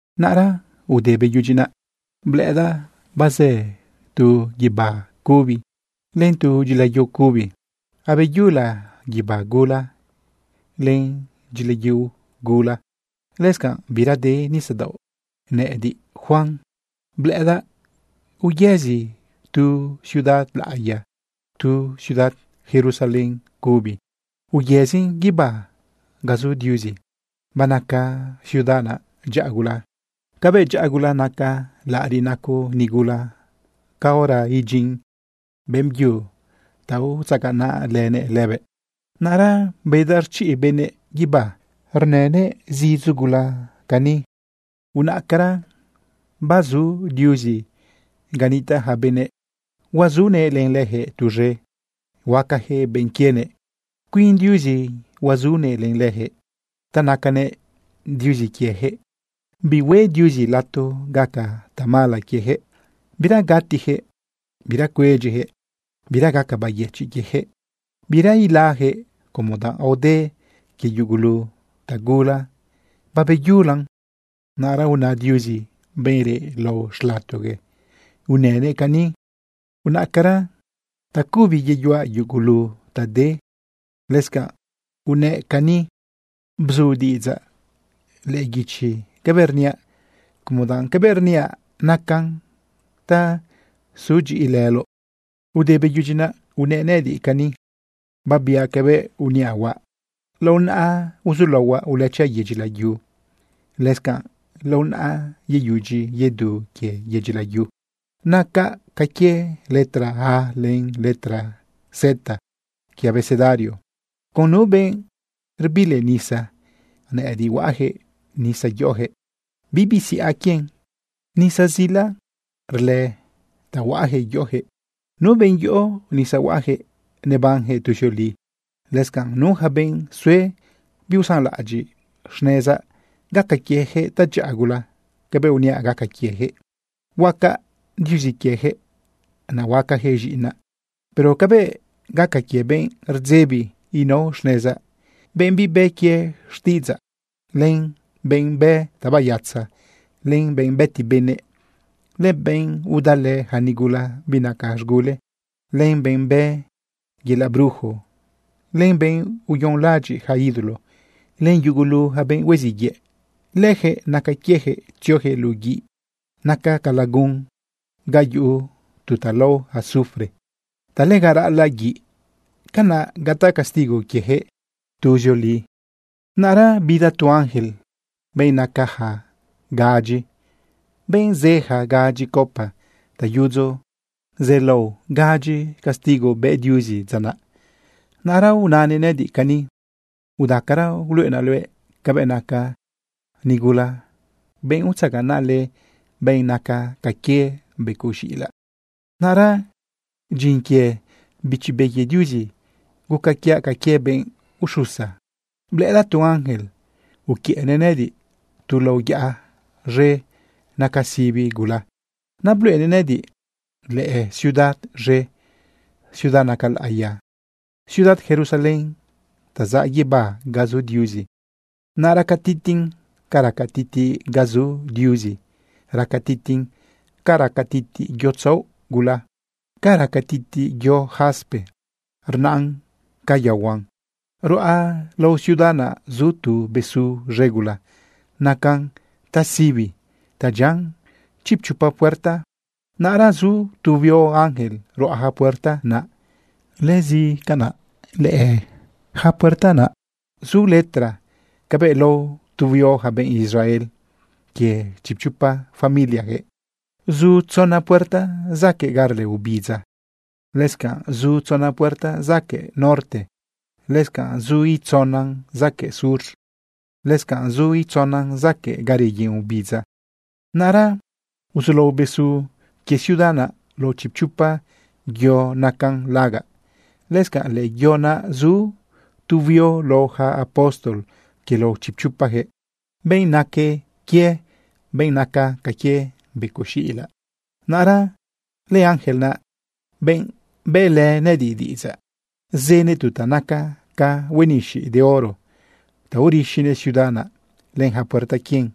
Naꞌra ude beyudyi naꞌ, blëꞌëdaꞌ bazë tu guibá cubi len tu dyilayu cubi. Abeyula guibá gula len dyilayu gula. Lëscanꞌ bira de nisadaoꞌ. Nëꞌëdiꞌ, Juan, blëꞌëdaꞌ bayëzi tu ciudad laꞌiya, tu ciudad Jerusalén cubi. Bayëzin guibá ga zu Diuzi. Banaca ciudad naꞌ dyaꞌa gula cabëꞌ dyaꞌa gula naca laꞌariꞌ naco nigula caora idyin beꞌmbyu ta utzaganaꞌlënëꞌ lëbëꞌ. Naꞌra bedaꞌ rchiꞌ benëꞌ guibá, rnënëꞌ zidzo gula cani: ―Unaꞌcara, bazu Diuzi ga nitaꞌ ja benëꞌ. Huazunëꞌ len lëjëꞌ tuz̃e. Huacajëꞌ benꞌ quienëꞌ. Cuin Diuzi huazunëꞌ len lëjëꞌ ta nacanëꞌ Diuzi quiejëꞌ. Bihue Diuzi lato gaca tamala quiejëꞌ. Bira gatijëꞌ, bira cuedyijëꞌ, bira gaca bayëchiꞌ quiejëꞌ, bira ilajëꞌ, como danꞌ aode quie yugulu tagula, babeyulan. Naꞌra una Diuzi, benꞌ reꞌ lao xlatogue, unënëꞌ cani: ―Unaꞌcara, tacubi reyuaꞌ yugulu ta de. Lëscanꞌ unëꞌ cani: ―Bzu diꞌidzaꞌ lëꞌë guichi cabëꞌ rniaꞌ, como danꞌ cabëꞌ rniaꞌ nacan ta sudyiꞌilëloꞌ. Ude beyudyi naꞌ unëꞌ nëꞌëdiꞌ cani: ―Babiaꞌ cabëꞌ uniaꞌ huaꞌ. Lao naꞌa uzulaohuaꞌ ulëchaꞌ yedyi layu. Lëscanꞌ lao naꞌa yeyudyi yedu quie yedyi layu. Nacaꞌ ca quie letra A len letra Z quie abecedario. Con nu benꞌ rbili nisa, nëꞌëdiꞌ huaꞌjëꞌ nisa yoꞌojëꞌ, bibi siꞌa quien. Nisa zila rlë ta huaꞌjëꞌ yoꞌojëꞌ. Nu benꞌ yoꞌo nisa huaꞌjëꞌ, nebanjëꞌ tuzioli. Lëscanꞌ nu yaca benꞌ sue biusanlaꞌadyiꞌ xnezaꞌ, gaca quiejëꞌ tadyaꞌa gula cabëꞌ uniaꞌ gaca quiejëꞌ. Huacaꞌ Diuzi quiejëꞌ, naꞌ huacajëꞌ z̃iꞌinaꞌ. Pero cabëꞌ gaca quie benꞌ rdzebi inao xnezaꞌ, benꞌ bibë quie xtiꞌidzaꞌ, len benꞌ bë tabayatza, len benꞌ bëti benëꞌ, len benꞌ udalë ja nigula binaca z̃gule, len benꞌ bë yelaꞌ brujo, len benꞌ uyonlaꞌadyiꞌ ja ídolo, len yugulu ja benꞌ hueziꞌ yëꞌ, lëjëꞌ naca quiejëꞌ tziojëꞌ luꞌu guiꞌ naca ca lagun ga yuꞌu tu ta lao azufre ta lega raꞌalaꞌ guiꞌ. Canaꞌ gataꞌ castigo quiejëꞌ tuzioli. Naꞌra bida tu ángel, benꞌ nacaja gadyi, benꞌ zë ja gadyi copa ta yudzo zelao gadyi castigo bë Diuzi dza naꞌ. Naꞌra unanëꞌ nëꞌëdiꞌ cani: ―Udacara, uluꞌenaꞌ luëꞌ cabëꞌ naca nigula, benꞌ utzaganaꞌlë benꞌ naca ca quie becoꞌ z̃iꞌilaꞌ. Naꞌra dyin quie Bichi Be quie Diuzi, guca quiaꞌ ca quie benꞌ uxusa. Blëꞌëdaꞌ tu ángel uquiëꞌnëꞌ nëꞌëdiꞌ tu lao yaꞌa z̃e naca sibi gula. Naꞌ bluꞌenëꞌ nëꞌëdiꞌ lëciudad z̃e, ciudad naca laꞌiya, ciudad Jerusalén ta zaꞌ guibá ga zu Diuzi. Naꞌ raca titiꞌn ca raca titiꞌ ga zu Diuzi. Raca titiꞌn ca raca titiꞌ yo tzaoꞌ gula, ca raca titiꞌ yo jaspe rnaꞌn ca yaohuan. Ruꞌa lao ciudad naꞌ zu tu besu z̃e gula nacan tasibi ta dyian chipchopa puerta. Naꞌra zu tu huio ángel ruꞌa ja puerta naꞌ. Lëscanꞌ lëꞌë ja puerta naꞌ zu letra cabëꞌ lao tu huio ja benꞌ Israel quie chipchopa familiajëꞌ. Zu tzona puerta zaquëꞌ ga rlë obidza. Lëscanꞌ zu tzona puerta zaquëꞌ norte, lëscanꞌ zu itzonan zaquëꞌ sur, lëscanꞌ zu itzonan zaquëꞌ ga reyen obidza. Naꞌra uzulao besu quie ciudad naꞌ lao chipchopa yo nacan lagaꞌ. Lëscanꞌ lëꞌë yo naꞌ zu tu huio lao ja apóstol quie lao chipchopajëꞌ, benꞌ naque quie benꞌ naca ca quie becoꞌ z̃iꞌilaꞌ. Naꞌra lëángel naꞌ, benꞌ bëꞌlënëꞌ nëꞌëdiꞌ diꞌidzaꞌ, zënëꞌ tu ta naca ca huenixiꞌ de oro ta urixinëꞌ ciudad naꞌ, len ja puerta quien,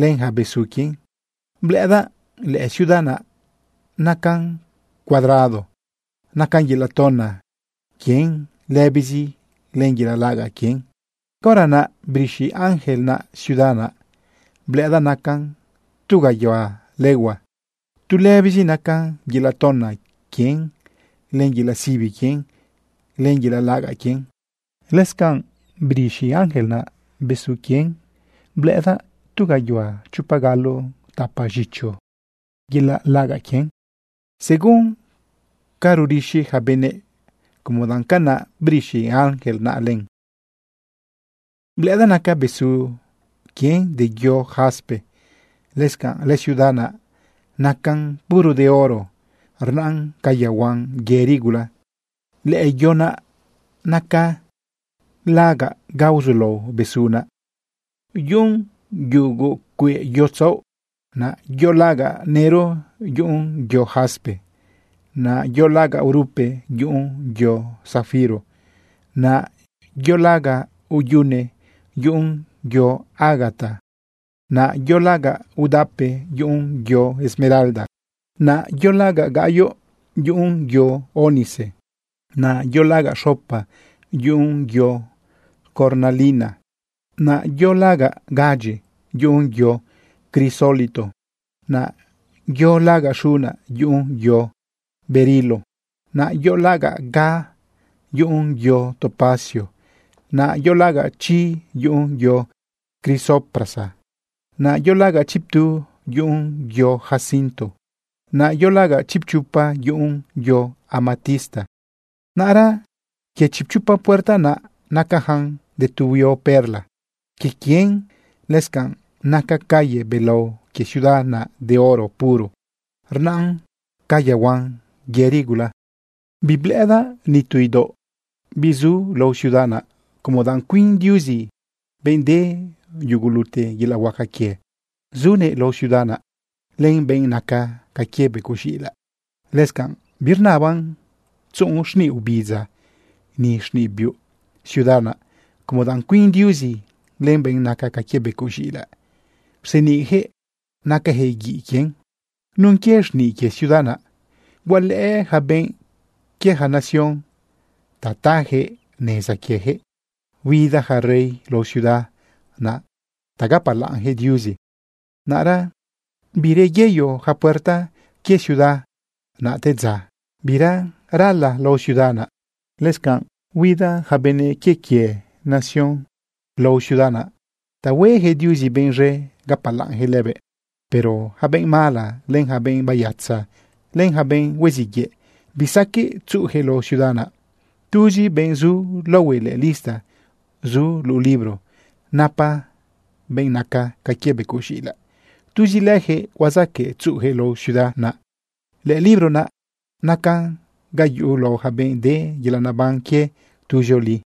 len ja besu quien. Blëꞌëdaꞌ lëciudad naꞌ nacan cuadrado. Nacan yelaꞌ tona quien lëbizi len yelaꞌ lagaꞌ quien. Caora naꞌ brixi ángel naꞌ ciudad naꞌ blëꞌëdaꞌ nacan tu gayuhua legua. Tu lëbizi nacan yelaꞌ tona quien len yelaꞌ sibi quien len yelaꞌ lagaꞌ quien. Lëscanꞌ brixi ángel naꞌ besu quien blëꞌëdaꞌ tu gayuhua chopa galo tapa z̃icho yelaꞌ lagaꞌ quien, según ca rurixi ja benëꞌ como danꞌ canaꞌ brixi ángel naꞌ len. Blëꞌëdaꞌ naca besu quien de yo jaspe. Lëscanꞌ lëciudad naꞌ nacan puro de oro rnaꞌn ca yaohuan yëri gula. Lëꞌë yo naca lagaꞌ ga uzulao besu naꞌ, yuꞌun yugu cueꞌ yo tzaoꞌ. Naꞌ yo lagaꞌ nëro, yuꞌun yo jaspe. Naꞌ yo lagaꞌ urupe, yuꞌun yo safiro. Naꞌ yo lagaꞌ uyune, yuꞌun yo ágata. Naꞌ yo lagaꞌ udape, yuꞌun yo esmeralda. Naꞌ yo lagaꞌ gaꞌyoꞌ, yuꞌun yo ónice. Naꞌ yo lagaꞌ xopa, yuꞌun yo cornalina. Naꞌ yo lagaꞌ gadyi, yuꞌun yo crisólito. Naꞌ yo lagaꞌ xuna, yuꞌun yo berilo. Naꞌ yo lagaꞌ ga, yuꞌun yo topacio. Naꞌ yo lagaꞌ chi, yuꞌun yo crisoprasa. Naꞌ yo lagaꞌ chiptu, yuꞌun yo jacinto. Naꞌ yo lagaꞌ chipchopa, yuꞌun yo amatista. Naꞌra quie chipchopa puerta naꞌ nacajan de tu huio perla quie quien. Lëscanꞌ naca calle belao quie ciudad naꞌ de oro puro. Rnaꞌn ca yaohuan yëri gula. Biblëꞌëdaꞌ nitu idaoꞌ bizu lao ciudad naꞌ como danꞌ cuin Diuzi, benꞌ de yugulute yelaꞌ huaca quie, zunëꞌ lao ciudad naꞌ len benꞌ naca ca quie becoꞌ z̃iꞌilaꞌ. Lëscanꞌ birnaban tzuꞌun xniꞌ obidza ni xniꞌ biuꞌ ciudad naꞌ, como danꞌ cuin Diuzi len benꞌ naca ca quie becoꞌ z̃iꞌilaꞌ rseniꞌjëꞌ nacajëꞌ guiꞌ quien. Nun quie xniꞌ quie ciudad naꞌ, hualëꞌë ja benꞌ quie ja nación ta tajëꞌ neza quiejëꞌ. Huida ja rey lao ciudad naꞌ ta gapalaꞌnjëꞌ Diuzi. Naꞌra bireyeyo ja puerta quie ciudad naꞌ te dza. Bira rala lao ciudad naꞌ. Lëscanꞌ huida ja benëꞌ quie quie nación lao ciudad naꞌ ta huejëꞌ Diuzi benꞌ z̃e gapalaꞌnjëꞌ lëbëꞌ. Pero yaca benꞌ mala, len yaca benꞌ bayatza, len yaca benꞌ hueziꞌ yëꞌ, bisaqueꞌ tzuꞌujëꞌ lao ciudad naꞌ. Tuzi benꞌ zu laohue lëꞌë lista zu luꞌu libro napa benꞌ naca ca quie becoꞌ z̃iꞌilaꞌ, tuzi lëjëꞌ huazaqueꞌ tzuꞌujëꞌ lao ciudad naꞌ. Lëlibro naꞌ nacan ga yuꞌu lao ja benꞌ de yelaꞌ neban quie tuzioli.